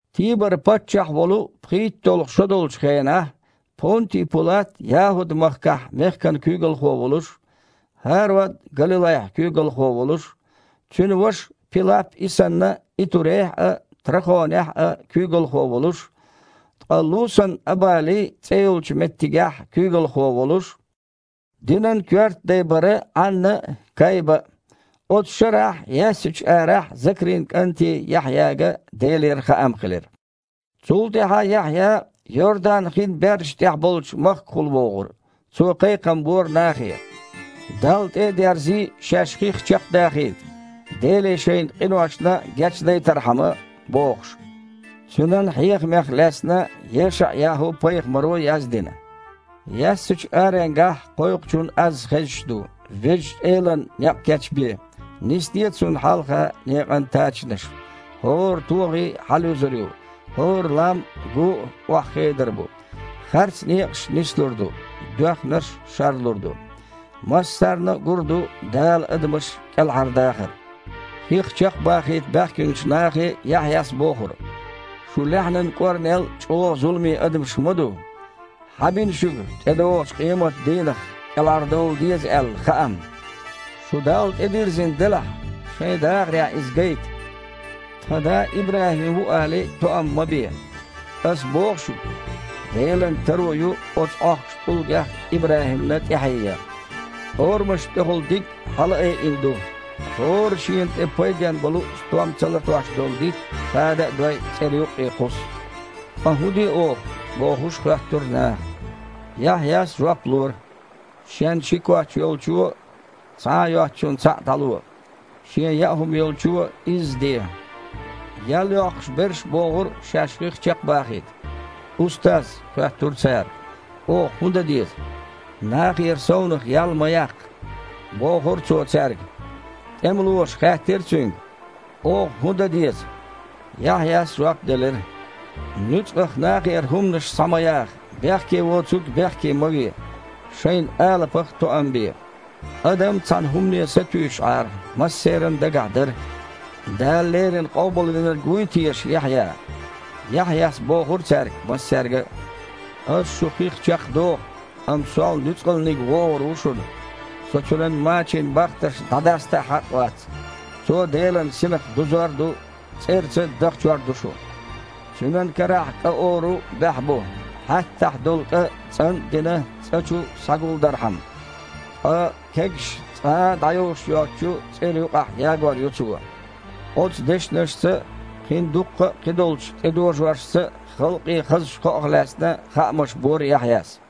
Тибар паччахь волу пхийтталгІа шо долчу хенахь, Понти Пулат ЯхІуд-махкахь мехкан куьйгалхо волуш, ХІарод Галилайхь куьйгалхо волуш, цуьнан ваша Пилап и санна Итурейхь а, Трахонехь а куьйгалхо волуш, ткъа Лусан Абали цІе йолчу меттигехь куьйгалхо волуш, динан коьрта дай бара Іанна а, Кайба а. Оцу шарахь яьссачу арахь Закрин кІанте Яхьъяга Делера хаам хилира. Цул тІаьхьа Яхьъя Йордан-хин бердаш тІехь болчу махкахула вогІура. Цо кхайкхам бора нахе: «Далла тІе а дерзий, шаьш хих чекхдахийта, Деле шайн къиношна гечдайтархьама», – бохуш. Цуьнан хьехамех лаьцна ЕшаІ-ЯхІу-пайхамаро яздина: «Яьссачу аренгахь кхойкхучун аз хезаш ду: „Везачу Элана некъ кечбе! Нисде Цунна хьалха некъан тачанаш! ХІора тогІи хьалаюзур ю, хІора лам а, гу а охьахедар бу. Харц некъаш нислур ду, доьхнарш шарлур ду. Массарна а гур ду Дала адамаш кІелхьардахар!“» Хих чекхбахийта баьхкинчу нахе Яхьъяс бохура: «Шу лаьхьанан кІорнел а чІогІа зуламе адамаш ма ду! Хьан бина шуьга, тІедогІучу къематан дийнах кІелхьардовла деза аьлла, хаам? Шу Далла тІедирзина делахь, шайн дахарехь иза гайта. „Тхан да ИбрахІим ву“, – алий, тоам ма бе. Ас боху шуьга, Делан таро ю оцу Іохкучу тІулгех а ИбрахІимна тІаьхье ян. Орамашна тІехула диг хьалаайина ду: хІора шена тІе пайден болу стом ца латтош долу дитт, хада а дой, цІера юккъе кхуссу». «Ткъа хІун де оха?» – бохуш хоьттура наха. Яхьъяс жоп лора: «Шен ши коч йолчо цхьа а йоцучунна цхьаъ дІало, шен яа хІума йолчо изза де». Ял йоккхуш берш а богІура шаьш хих чекхбахийта. «Устаз! – хоьттура цара, – оха хІун дан деза?» «Нахера совнаха ял ма яккха», – бохура цо цаьрга. ТІемалоша хаьттира цуьнга: «Оха хІун дан деза?» Яхьъяс жоп делира: «Нуьцкъах нахера хІуманаш схьа ма яха, бехке воцург бехке ма ве, шайн алапах тоам бе». Адам цхьана хІумане сатуьйсуш Іара, массеран дагахь дара: « Дала леррина Къобалвинарг вуй теша Яхьъя?» Яхьъяс бохура цаьрга массаьрга а: «Ас шу хих чекхдоху, амма сол нуьцкъалниг вогІур ву шуна, со Цуьнан мачийн бахтарш дІадаста а хьакъ вац. Цо Делан Синах дузор а ду, цІерца а дахчор ду шу. Цуьнан карахь кІа ору баьхьа бу, хьаьттахь долу кІа, цІан а дина, цІа чу схьагулдархьама. Ткъа кегаш цкъа а дІайовш йоцучу цІера юкъахь ягор ю Цо». Оцу дешнашца а, кхин дуккха а кхидолчу тІедожоршца а халкъе хазачу кхоах лаьцна хаамаш бора Яхьъяс.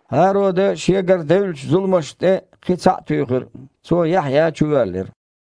ХІарода шегара девллачу зуламашна тІе кхин цхьаъ а туьйхира: цо Яхьъя чувоьллира.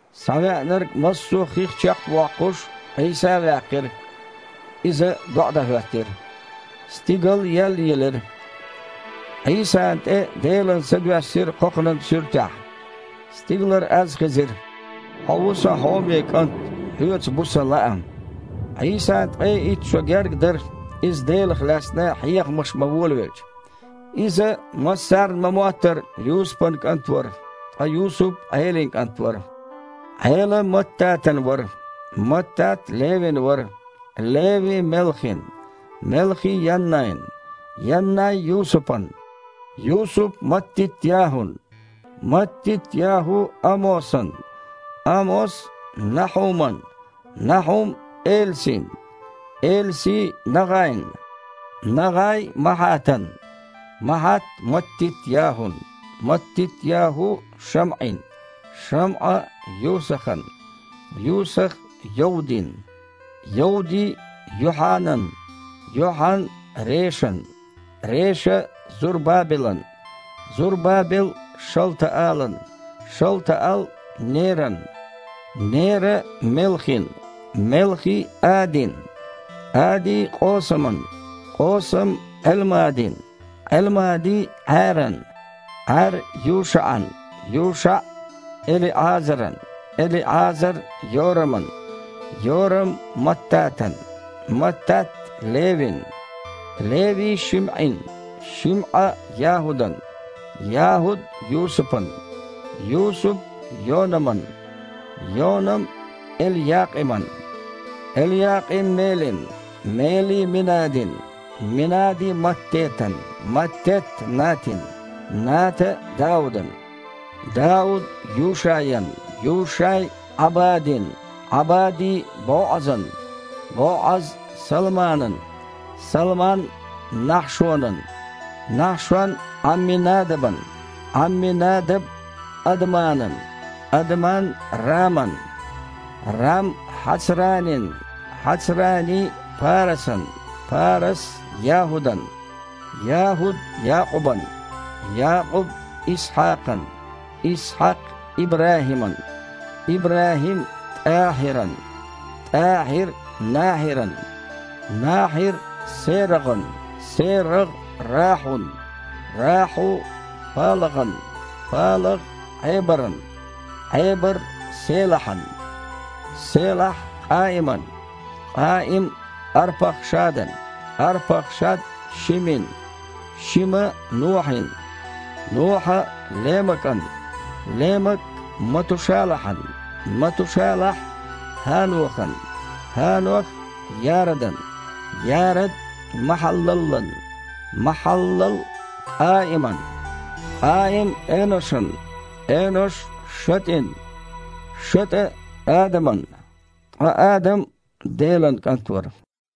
Схьавеанарг массо а хих чекхвоккхуш, Іийса а ваьккхира. Иза доІа дан хІоьттира – стигал еллаелира. Іийсана тІе Делан Са доьссира кхокханан суьртехь. Стигалара аз хезира: «Хьо ву Сан хьоме КІант! Хьоьца бу Сан лаам!» Іийсан ткъе итт шо гергга дара, Иза Делах лаьцна хьехамаш бан волавелча. Иза, массарна ма-моттара, Юсупан кІант вара, ткъа Юсуп Іелин кІант вара, Іела Маттатан вара, Маттат Левин вара, Леви Мелхин, Мелхи Яннайн, Яннай Юсупан, Юсуп Маттит-ЯхІун, Маттит-ЯхІу Амосан, Амос Нахьуман, Нахьум Элсин, Элси НагІайн, НагІай Махьатан, Махьат Маттит-ЯхІун, Маттит-ЯхІу ШамІин, ШамІа Юсахан, Юсах Йовдин, Йовди Йохьанан, Йохьан Решан, Реша Зурбабелан, Зурбабел Шалтаалан, Шалтаал Неран, Нера Мелхин, Мелхи Адин, Ади Къосаман, Къосам Іелмадин, Іелмади Іаьран, Іаьр ЮшаІан, ЮшаІ ЭлиІазаран, ЭлиІазар Йораман, Йорам Маттатан, Маттат Левин, Леви ШимІин, ШимІа ЯхІудан, ЯхІуд Юсупан, Юсуп Йонаман, Йонам Элъякъиман, Элъякъим Мелин, Мели Минадин, Минади Маттетан, Маттет Натин, Ната Даудан, Дауд Юшаян, Юшай Іабадин, Іабади БоІазан, БоІаз Салманан, Салман Нахьшонан, Нахьшон Іамминадабан, Іамминадаб Адманан, Адман Раман, Рам Хьацранин, Хьацрани Парасан, Парас ЯхІудан, ЯхІуд Якъубан, Якъуб Исхьакхан, Исхьакх ИбрахІиман, ИбрахІим ТІахьиран, ТІахьир Нахьиран, Нахьир СерагІан, СерагІ Рахьун, Рахьу ПалагІан, ПалагІ Іебаран, Іебар Селахьан, Селахь Къаиман, Къаим Арпахшадан, Арпахшад Шимин, Шима Нохьин, Нохьа ЛемакІан, ЛемакІ Матушалахьан, Матушалахь ХІанохан, ХІанох Ярадан, Ярад Махьаллалан, Махьаллал Къаиман, Къаим Эношан, Энош ШатІин, ШатІа Адаман, ткъа Адам – Делан кІант вара.